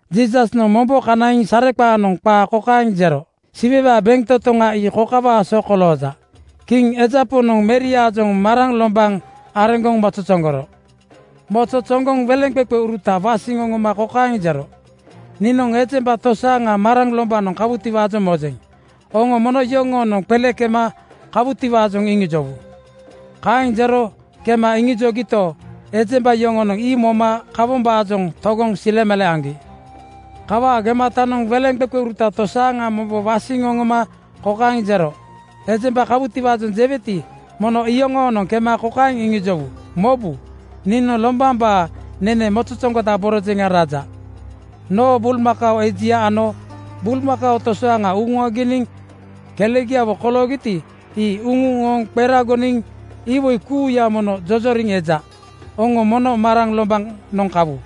Jiisasnoŋ mombo kanaiŋ sareqaanoŋ qaa kokaeŋ jero, “Siwewaa bentotoŋa ii kokawaa so kolooja: Kiŋ eja Poŋnoŋ meriaajoŋ maraŋ (agomiŋ aoao) lombaŋ areŋgoŋ mozozoŋgoro. Mozozoŋgoŋ weleŋqeqeuruta wasiŋ oŋoma kokaeŋ jero, ‘Niinoŋ ejemba tosaaŋa maraŋ lombanoŋ kawutiwaajoŋ mojeŋ. Oŋo mono yoŋoonoŋ qele kema kawutiwaajoŋ iŋijowu.’ Kaeŋ jero kema iŋijogito, ejemba yoŋonoŋ ii moma kawombaajoŋ togoŋ silemale aŋgi. “Kawaa gematanoŋ weleŋqeqeuruta tosaaŋa mombo wasiŋ oŋoma kokaeŋ jero, ‘Ejemba kawutiwaajoŋ jeweti, mono iyoŋoonoŋ kema kokaeŋ iŋijowu: Mobu, niinoŋ lombambaa nenena mozozoŋgodaborojeŋa raja. Noo bulmakao ejia ano bulmakao tosaaŋa uŋuaginiŋ kelegiawo koloogiti, ii uŋuŋ ooŋ qeragoniŋ iwoi kuuya mono jojoriŋ eja. Oŋo mono maraŋ lombanoŋ kawu.’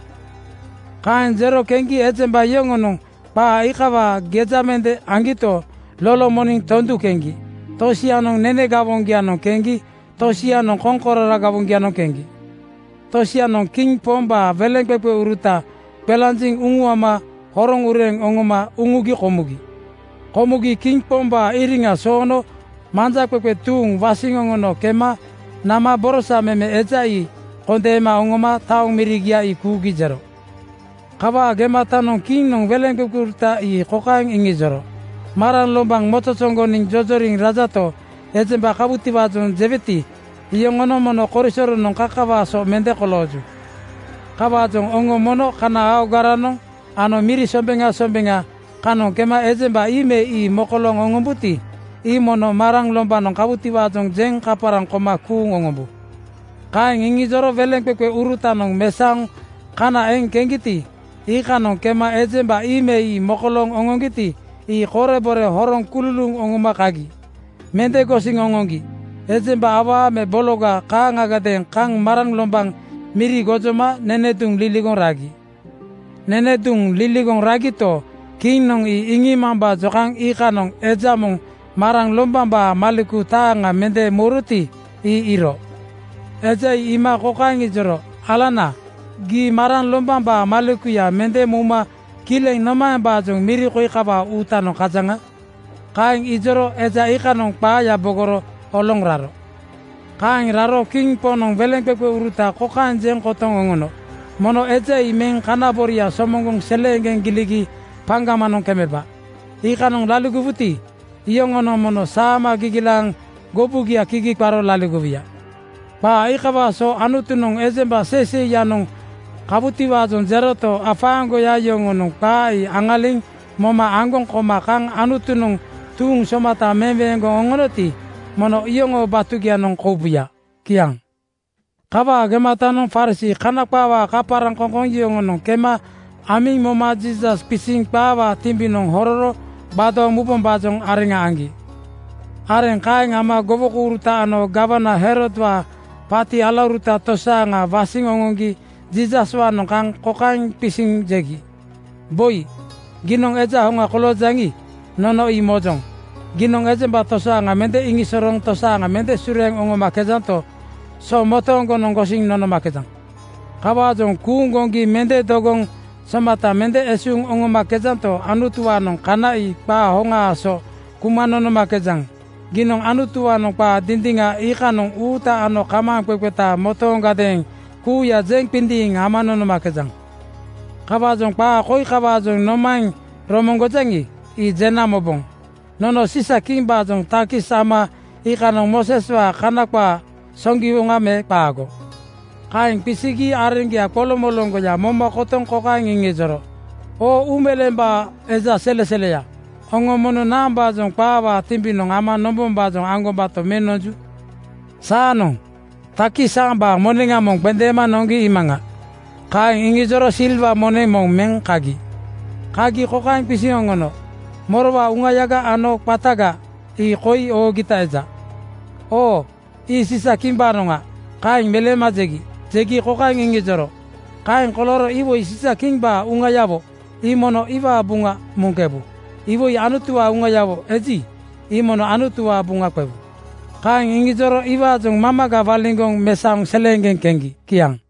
“Kaeŋ jero keŋgi ejemba yoŋonoŋ qaa iikawaa geja mende aŋgito, lolomoniŋ tondu keŋgi. Tosianoŋ nene gawoŋgianoŋ keŋgi tosianoŋ koŋkororo gawoŋgianoŋ keŋgi. Tosianoŋ kiŋ pombaa weleŋqeqeuruta qelanjiŋ uŋuama horoŋ ureeŋ oŋoma uŋugi komugi. Komugi kiŋ pombaa iriŋa soono manjaqeqe tuuŋa wasiŋ oŋono kema nama borosa meme eja ii kondeema oŋoma taoŋ mirigia ii kuugi jero. “Kawaa gematanoŋ kiŋnoŋ weleŋqeqeuruta ii kokaeŋ iŋijoro, ‘Maraŋ lombaŋ mozozoŋgoniŋ jojoriŋ rajato, ejemba kawutiwaajoŋ jeweti, iyoŋonoŋ mono korisoronoŋ kakawaa so mende kolooju. Kawaajoŋ oŋo mono kana aogaranoŋ ano miri sombeŋa sombeŋa kanoŋ kema ejemba ii me ii mokolooŋ oŋombuti, ii mono maraŋ lombanoŋ kawutiwaajoŋ jeŋ kaparaŋ koma kuuŋ oŋombu.’ “Kaeŋ iŋijoro weleŋqeqeurutanoŋ mesaoŋ kana eŋ keŋgiti, iikanoŋ kema ejemba ii me ii mokolooŋ oŋoŋgiti, ii korebore horoŋ kululuuŋ oŋoma kagi. Mende gosiŋ oŋoŋgi ejemba awaa ano bologa kaaŋadeeŋ kaŋ maraŋ lombaŋ miri gojoma nene duŋ liligoŋ ragi. Nene duŋ liligoŋ ragito, kiŋnoŋ ii iŋiimambaajoŋ kaŋ iikanoŋ eja moŋ maraŋ lombambaa maleku taaŋa mende mouroti, ii iiro. Eja ii iima kokaeŋ ijoro, ‘Alana, gii maraŋ lombambaa malekuya mende mouma kileŋ nomaembaajoŋ miri koi kawaa uutanoŋ kajaŋa?’ Kaeŋ ijoro eja iikanoŋ qaaya bogoro oloŋ raro. “Kaeŋ raro kiŋ poŋnoŋ weleŋqeqeuruta kokaeŋ jeŋ kotoŋ oŋono, ‘Mono eja ii meŋ kana boria somoŋgoŋ seleeŋgeŋ giligi paŋgamanoŋ kemeba.’ Iikanoŋ laligowuti, iyoŋonoŋ mono saama gigilaaŋ gobugia kigi qaro laligowuya. Qaa iikawaa so Anutunoŋ ejemba seiseiyanoŋ kawutiwaajoŋ jeroto, afaaŋgoya yoŋonoŋ qaa ii aŋaliŋ moma aŋgoŋ koma kaŋ Anutunoŋ tuuŋ somata meweeŋgoŋ oŋonoti, mono iyoŋoo batugianoŋ koubuya.” Kiaŋ. Kawaa gematanoŋ Farisii (Kana qaawaa kaparaŋkoŋkoŋ) yoŋonoŋ kema amiŋ moma Jiisas qisiŋ qaawaa timbinoŋ hororo gbadooŋ mubombaajoŋ areŋa aŋgi. Areŋ kaeŋ ama gowokouruta ano gawana Herodwaa paati alauruta tosaaŋa wasiŋ oŋoŋgi Jiisaswaanoŋ kaŋ kokaeŋ qisiŋ jegi, “Boi, giinoŋ eja hoŋa koloojaŋi, nono ii mojoŋ. Giinoŋ ejemba tosaaŋa mende iŋisosorooŋ tosaaŋa mende sureeŋ oŋomakejanto, so motooŋgonoŋ gosiŋ nonomakejaŋ. Kawaajoŋ kuuŋ goŋgi mende dogoŋ somata mende esuuŋ oŋomakejanto, Anutuwaanoŋ kana ii qaa hoŋaa so kuma nonomakejaŋ. Giinoŋ Anutuwaanoŋ qaa dindiŋa iikanoŋ uuta ano kamaaŋqeqeta motoondeeŋ kuuya jeŋ qindiiŋ ama nonomakejaŋ. Kawaajoŋ qaa koi kawaajoŋ nomaeŋ romoŋgojaŋi, ii jena moboŋ. Nono Siisa-kimbaajoŋ takis ama iikanoŋ Mooseswaa Kana qaa soŋgiwoŋa me qaago?” Kaeŋ qisigi areŋgia qoloŋmoloŋgoya moma kotoŋ kokaeŋ iŋijoro, “Oo uumeleembaa eja seleseleya, oŋo mono naambaajoŋ qaawaa timbinoŋ ama nombombaajoŋ aŋgobato meŋ nonju? Saanoŋ takis aambaa moneŋa moŋ qendeema noŋgi iimaŋa.” Kaeŋ iŋijoro silwa moneŋ moŋ meŋ kagi. Kagi kokaeŋ qisiŋ oŋono, “Morowaa uŋayaga ano qataga ii koi oogita eja?” “Oo ii Siisa-kimbaanoŋa,” kaeŋ meleema jegi. Jegi kokaeŋ iŋijoro, “Kaeŋ kolooro iwoi Siisa-kimbaa uŋayawo ii mono iwaa buŋa muŋkebu. Iwoi Anutuwaa uŋayawo eji, ii mono Anutuwaa buŋa qewu.” Kaeŋ iŋijoro iwaajoŋ mamaga waliŋgoŋ mesaoŋ seleeŋgeŋ keŋgi. Kiaŋ.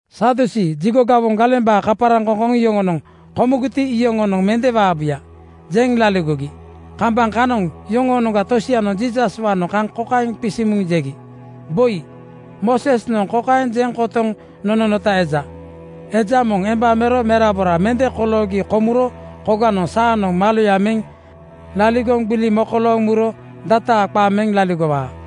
Sadusii (Jigo gawombaa kaparaŋkoŋkoŋ) yoŋonoŋ ‘Komugiti, iyoŋonoŋ mende waabuya,’ jeŋ laligogi. Kambaŋ kanoŋ yoŋoonoŋga tosianoŋ Jiisaswaanoŋ kaŋ kokaeŋ qisiŋ muŋ jegi, “Boi, Moosesnoŋ kokaeŋ jeŋ kotoŋ nononota eja, ‘Eja moŋ emba mero merabora mende koloogi komuro koganoŋ saanoŋ maloya meŋ laligoŋ gbili mekolooŋ muro dataa qa meŋ laligowaa.’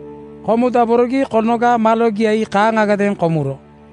Komudaborogi konoga malogia ii kaaŋagadeeŋ komuro.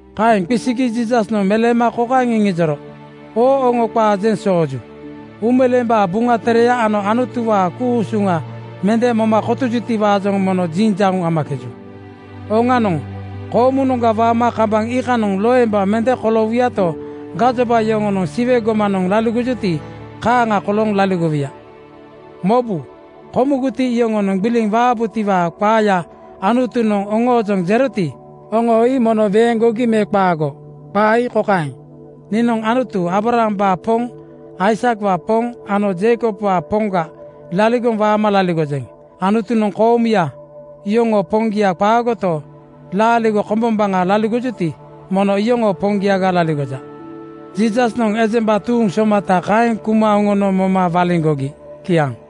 Kaeŋ qisigi Jiisasnoŋ meleema kokaeŋ iŋijoro, “Oŋo qaa jeŋ sooju. Uumeleembaa Buŋa Tereya ano Anutuwaa ku-usuŋa mende moma kotojutiwaajoŋ mono jiŋjauŋ amakeju. Oŋanoŋ, koomunoŋga waama kambaŋ iikanoŋ loemba mende koloowuyato, gajoba yoŋonoŋ Siwe gomanoŋ laligojuti kaaŋa kolooŋ laligowuya. “Mobu! Komugiti, iyoŋonoŋ gbiliŋ waabutiwaa qaaya Anutunoŋ oŋoojoŋ jeroti, oŋo ii mono weeŋgogi me qaago? Qaa ii kokaeŋ, ‘Niinoŋ Anutu Aabrahambaa Poŋ, Aisakwaa Poŋ ano Jeikobwaa Poŋga laligoŋ waama laligojeŋ.’ Anutunoŋ koomuya yoŋoo Poŋgia qaagoto, laaligo kombombaŋa laligojuti, mono iyoŋoo Poŋgiaga laligoja.” Jiisasnoŋ ejemba tuuŋ somata kaeŋ kuma oŋono moma waliŋgogi. Kiaŋ.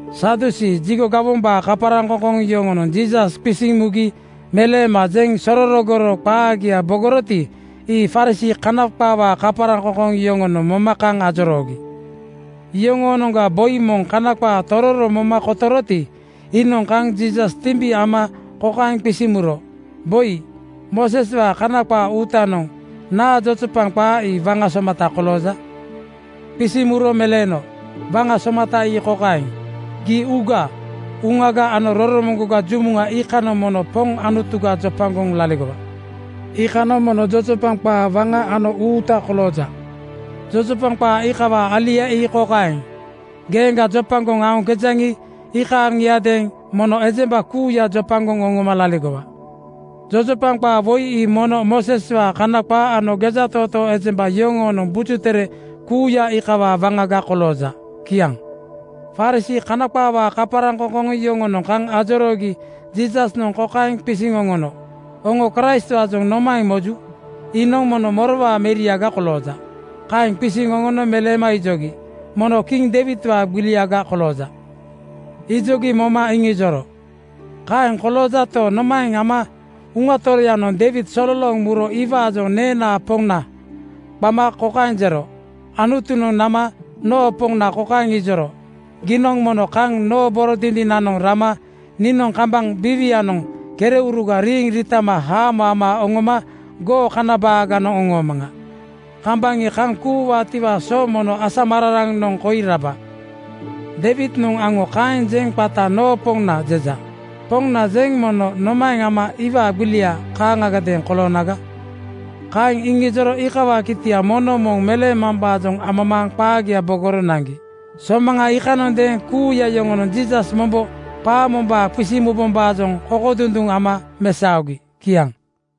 Sadusii (Jigo gawombaa kaparaŋkoŋkoŋ) yoŋonoŋ Jiisas qisiŋ mugi meleema jeŋ sororogoro qaagia bogoroti, ii Farisii (Kana qaawaa kaparaŋkoŋkoŋ) yoŋonoŋ moma kaŋ ajoroogi. Yoŋoonoŋga boi moŋ Kana qaa tororo moma kotoroti, iinoŋ kaŋ Jiisas timbi ama kokaeŋ qisiŋ muro, “Boi, Mooseswaa Kana qaa uutanoŋ naa jojopaŋ qaa ii waŋa somata kolooja?” Qisiŋ muro meleeno, “Waŋa somata ii kokaeŋ, ‘Gii uuga, uŋaga ano roromoŋgoga jumuŋa iikanoŋ mono Poŋ Anutuga jopagoŋ laligowa.’ Iikanoŋ mono jojopaŋ qaa waŋa ano uuta kolooja. Jojopaŋ qaa iikawaa alia ii kokaeŋ, ‘Geeŋga jopagoŋ aoŋkejaŋi, iikaaŋiadeeŋ mono ejemba kuuya jopagoŋ oŋoma laligowa.’ Jojopaŋ qaa woi ii mono Mooseswaa Kana qaa ano gejatootoo ejemba yoŋoonoŋ Buju Tere kuuya iikawaa waŋaga kolooja.” Kiaŋ. Farisii (Kana qaawaa kaparaŋkoŋkoŋ) yoŋonoŋ kaŋ ajoroogi Jiisasnoŋ kokaeŋ qisiŋ oŋono, “Oŋo Kraistwaajoŋ nomaeŋ moju? Iinoŋ mono morowaa meriaga kolooja?” Kaeŋ qisiŋ oŋono meleema ijogi, “Mono kiŋ Deiwidwaa gbiliaga kolooja.” Ijogi moma iŋijoro, “Kaeŋ koloojato, nomaeŋ ama Uŋa Toroyanoŋ Deiwid sololooŋ muro iwaajoŋ ‘Neenaa Poŋna,’ qama kokaeŋ jero, ‘Anutunoŋ nama noo Poŋna kokaeŋ ijoro, Giinoŋ mono kaŋ noo boro dindinanoŋ rana niinoŋ kambaŋ biiwianoŋ kereuruga riiŋ riitama haamo ama oŋoma goo kana baaganoŋ oŋoomaŋa. Kambaŋ ii kaŋ kuuwaatiwaa so mono asamararanoŋ koi raba.’ Deiwidnoŋ aŋo kaeŋ jeŋ qata ‘Noo Poŋna’ jeja. Poŋna jeŋ mono nomaeŋ ama iwaa gbilia kaaŋgadeeŋ koloonaga?” Kaeŋ iŋijoro iikawaa kitia moŋnoŋ moŋ meleemambaajoŋ amamaaŋ qaagia bogoro naŋgi. Somaŋa iikanondeeŋ kuuya yoŋonoŋ Jiisas mombo qaa mombaa qisiŋ mubombaajoŋ kokodunduŋ ama mesaogi. Kiaŋ.